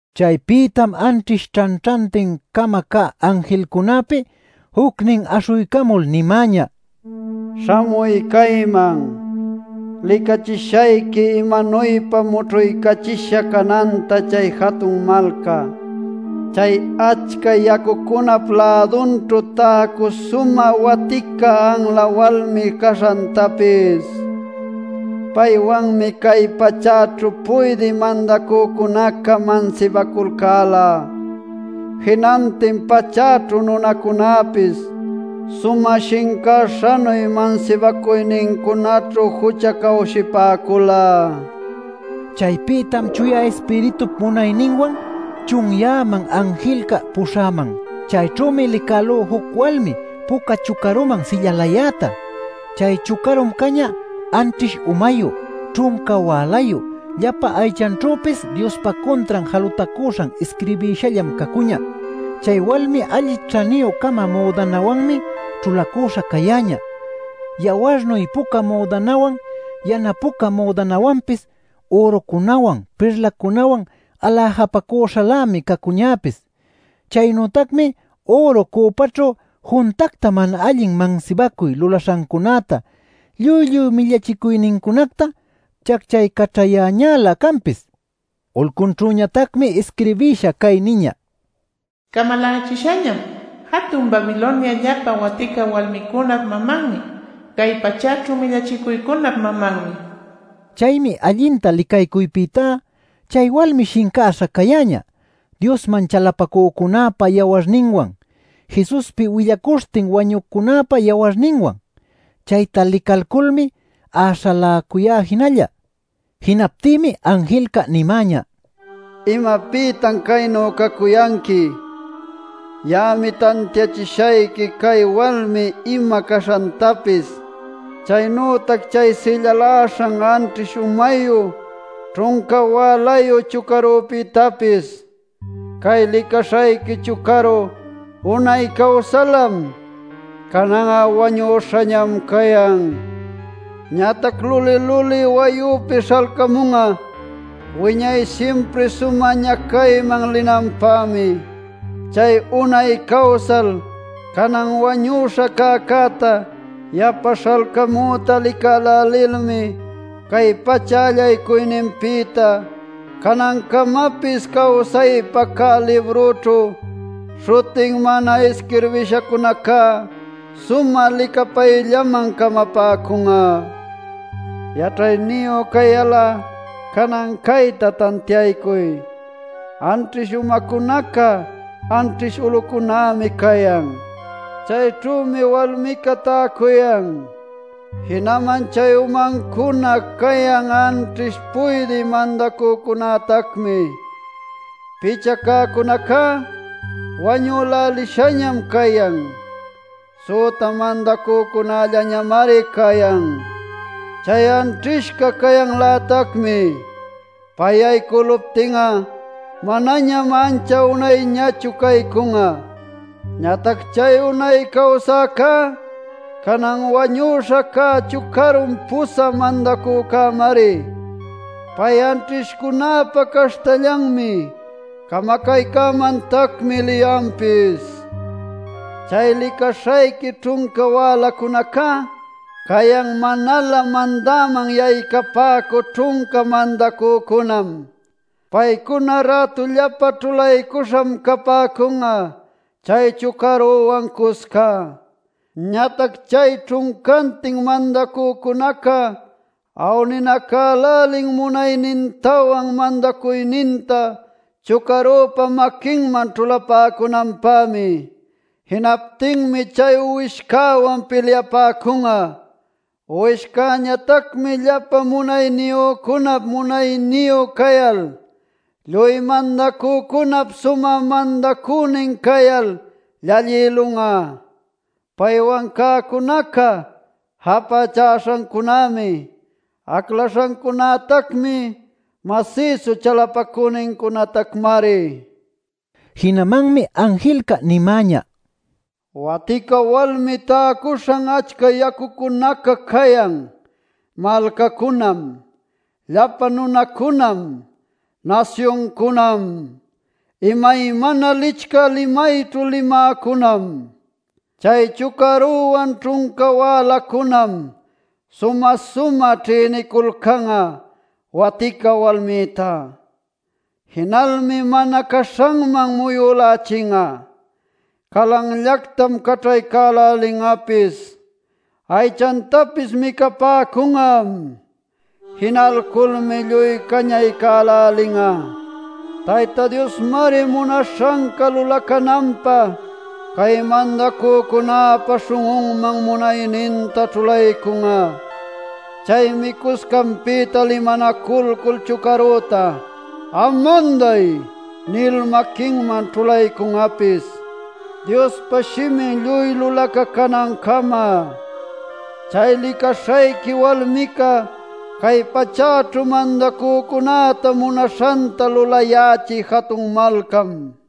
Chaypïtam anćhish ćhanćhantin-cama cä anjilcunäpi jucnin aśhuycamul nimäñä: “Śhamuy cayman. Licaycachishayqui imanuypa mućhuycachisha cananta chay jatun malca, chay achca yacucunap lädunćhu täcü sumä watica anla walmi caśhantapis. Paywanmi cay pachäćhu puydï mandacücunaca mansibaculcäla; jinantin pachäćhu nunacunäpis sumä shincäśhanuy mansibacuynincunaćhu juchacawshipäcula” nil. Chaypïtam Chuya Ispiritup munayninwan chunyäman anjilca puśhäman. Chayćhümi licälú juc walmi puca chucaruman sillalayäta. Chay chucarum cañä anćhish umayu, ćhunca wälayu, llapa aychanćhüpis Diospa cuntran jalutacuśhan isquirbïshallam cacuñä. Chay walmi alli ćhaniyü-cama müdanawanmi ćhulacüśha cayäñä: yawarnuy puca müdanawan, yana puca müdanawanpis; ürucunawan, pirlacunawan aläjapacuśhalämi cacuñäpis. Chaynütacmi üru cüpaćhu juntacta mana allin mansibacuy lulaśhancunäta lluy lluy millachicuynincunacta chacchaycaćhayäñälä canpis. Ulcunćhüñatacmi isquirbisha cay niñä: “Camalächishañam: Jatun Babilonia Llapa Watica Walmicunap Mamanmi, Cay Pachäćhu Millachicuycunap Mamanmi” nil. Chaymi allinta licaycuypïtá chay walmi shincäśha cayäñä Diosman chalapacücunäpa yawarninwan, Jesuspi willacuśhtin wañücunäpa yawarninwan. Chayta licalculmi äśhaläcuyá jinalla. Jinaptïmi anjilca nimäñä: “¿Imapïtan caynu cacuyanqui? Ya'ami tantiachishayqui chay walmi ima caśhantapis, chaynütac chay sillaläśhan anćhish umayu ćhunca wälayu chucarupïtapis. Cay licaśhayqui chucaru unay cawsalam, canan'a wañüśham cayan. Ñatac luli-luli wayüpi śhalcamun'a wiñay simpri sumä ñacayman linanpämi. Chay unay cawsal canan wañüśha cäcäta yapa śhalcamüta licälälilmi cay pacha allaycuyninpïta canancamapis cawsaypä cä librućhu śhutin mana isquirbishacunacá sumä licapayllaman camapäcun'a. “Yaćhayniyu cayal'a canan cayta tantiaycuy: Anćhish umacunaca anćhish ulucunämi cayan; chayćhümi walmica täcuyan. Jinaman chay umancuna cayan anćhish puydï mandacücunätacmi. Picha cäcunacá wañülälishañam cayan; süta mandacücällañamari cayan. Chay anćhishca cayanlätacmi; pay yaycüluptin'a manañam ancha unayñachu caycun'a. Ñatac chay unay cawsäcá, canan wañüśha cä chucarum pusä mandacücämari. Pay anćhishcunäpa caśhtallanmi; camacaycämantacmi liyanpis. “Chay licaśhayqui ćhunca wälacunacá cayan manalä mandäman yaycapäcü ćhunca mandacücunam. Paycuna rätullapa ćhulaycuśham capäcun'a chay chucaruwan cusca. Ñatac chay ćhuncantin mandacücunaca awninacälälin munaynintawan mandacuyninta chucarüpa maquinman ćhulapäcunanpämi. Jinaptinmi chay Uwishcäwan pilyapäcun'a. Uwishcäñatacmi llapa munayniyücunap munayniyu cayal, lluy mandacücunap sumä mandacünin cayal llallïlun'a; paywan cäcunaca japächäśhancunämi, aclaśhancunätacmi, masïsu chalapacünincunatacmari” nil. Jinamanmi anjilca nimäñä: “Watica walmi täcuśhan achca yacucunaca cayan: malcacunam, llapa nunacunam, nasyuncunam, imaymana licchä limayćhu limäcunam. Chay chucaruwan ćhunca wälacunam sumä-sumä ćhïniculcan'a watica walmïta. Jinalmi mana caśhanman muyülälichin'a; calanllactam caćhaycälälin'apis. Aychantapis micapäcun'am. Jinalculmi lluy cañaycälälin'a. Tayta Diosmari munaśhanca lulacananpä cay mandacücunäpa śhun'unman munayninta ćhulaycun'a. Chaymi cuscanpïta limanacuycul chucarüta ‘am manday’ nil maquinman ćhulaycun'apis Diospa shimin lluy lulacacunancama. Chay licaśhayqui walmica cay pachäćhu mandacücunäta munaśhanta lulayächï jatun malcam” nil.